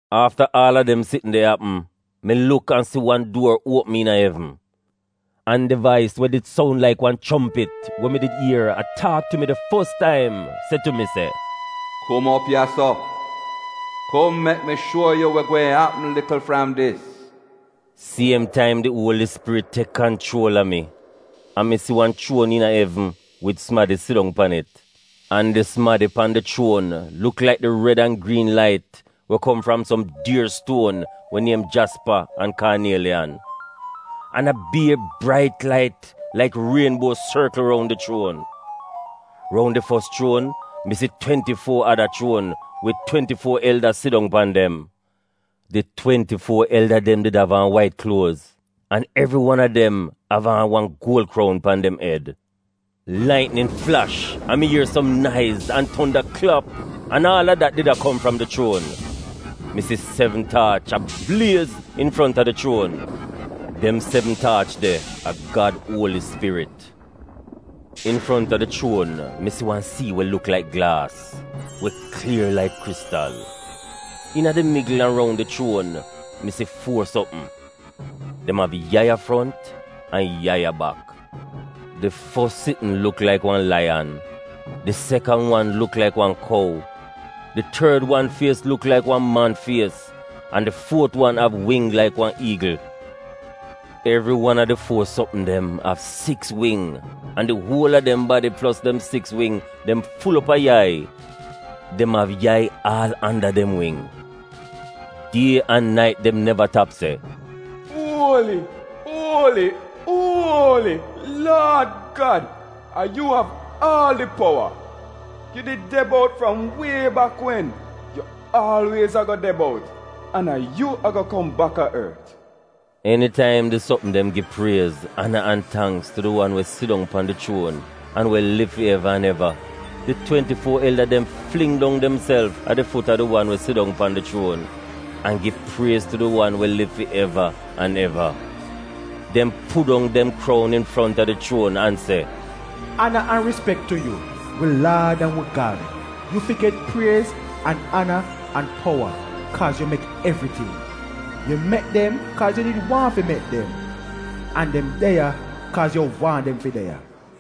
Afta aal a dem sitn de apm, mi luk an si wan duor uopm iina evn. An di vais we did soun laik wan chompit we mi did ier a taak tu mi di fos taim, se tu mi, “Kum op ya-so. Kum mek mi shuo yu we gweehn apm likl fram dis.” Siem taim di Uoli Spirit tek kanchuol a mi, an mi si wan chuon iina evn wid sumadi sidong pan it. An di sumadi pan di chuon luk laik di red an griin lait we kom fram som dier stuon we niem jaspa an kaanieliyan. An a bier brait lait laik rienbuo sorkl roun di chuon. Roun di fos chuon, mi si twenti-fuo ada chuon wid twenti-fuo elda sidong pan dem. Di twenti-fuo elda dem did av aan wait kluoz, an evri wan a dem av aan wan guol kroun pan dem ed. Laitnin flash an mi ier som naiz an tonda klap an aal a dat did a kom fram di chuon. Mi si sevn taach a bliez infronta di chuon. Dem sevn taach de a Gad Uoli Spirit. Infronta di chuon mi si wan sii we luk laik glaas, we klier laik kristal. Iina di migl an roun di chuon, mi si fuo sopm. Dem av yai a front an yai a bak. Di fos sitn luk laik wan laiyan, di sekan wan luk laik wan kou, di tord wan fies luk laik wan man fies, an di fuot wan av wing laik wan iigl. Evri wan a di fuo sopm dem av siks wing an di uol a dem badi plos dem siks wing dem ful op a yai. Dem av yai aal anda dem wing. Die an nait dem neva tap se: “Uoli, uoli, uoli Laad Gad a yu av aal di powa. Yu did de bout fram wie bak wen, yu aalwiez ago de bout, an a yu ago kom bak a ort.” Enitaim di sopm dem gi priez, ana an tangks tu di wan we sidong pan di chuon an we liv fi eva an eva, di twenti-fuo elda dem fling dong demself a di fut a di wan we sidong pan di chuon, an gi priez tu di wan we liv fi eva an eva. Dem put dong dem kroun infronta di chuon an se: “Ana an rispek tu yu, wi Laad an wi Gad, yu fi get priez an ana an powa, kaaz yu mek evriting. Yu mek dem kaaz yu did waahn fi mek dem. An dem de ya kaaz yu waahn dem fi de ya.”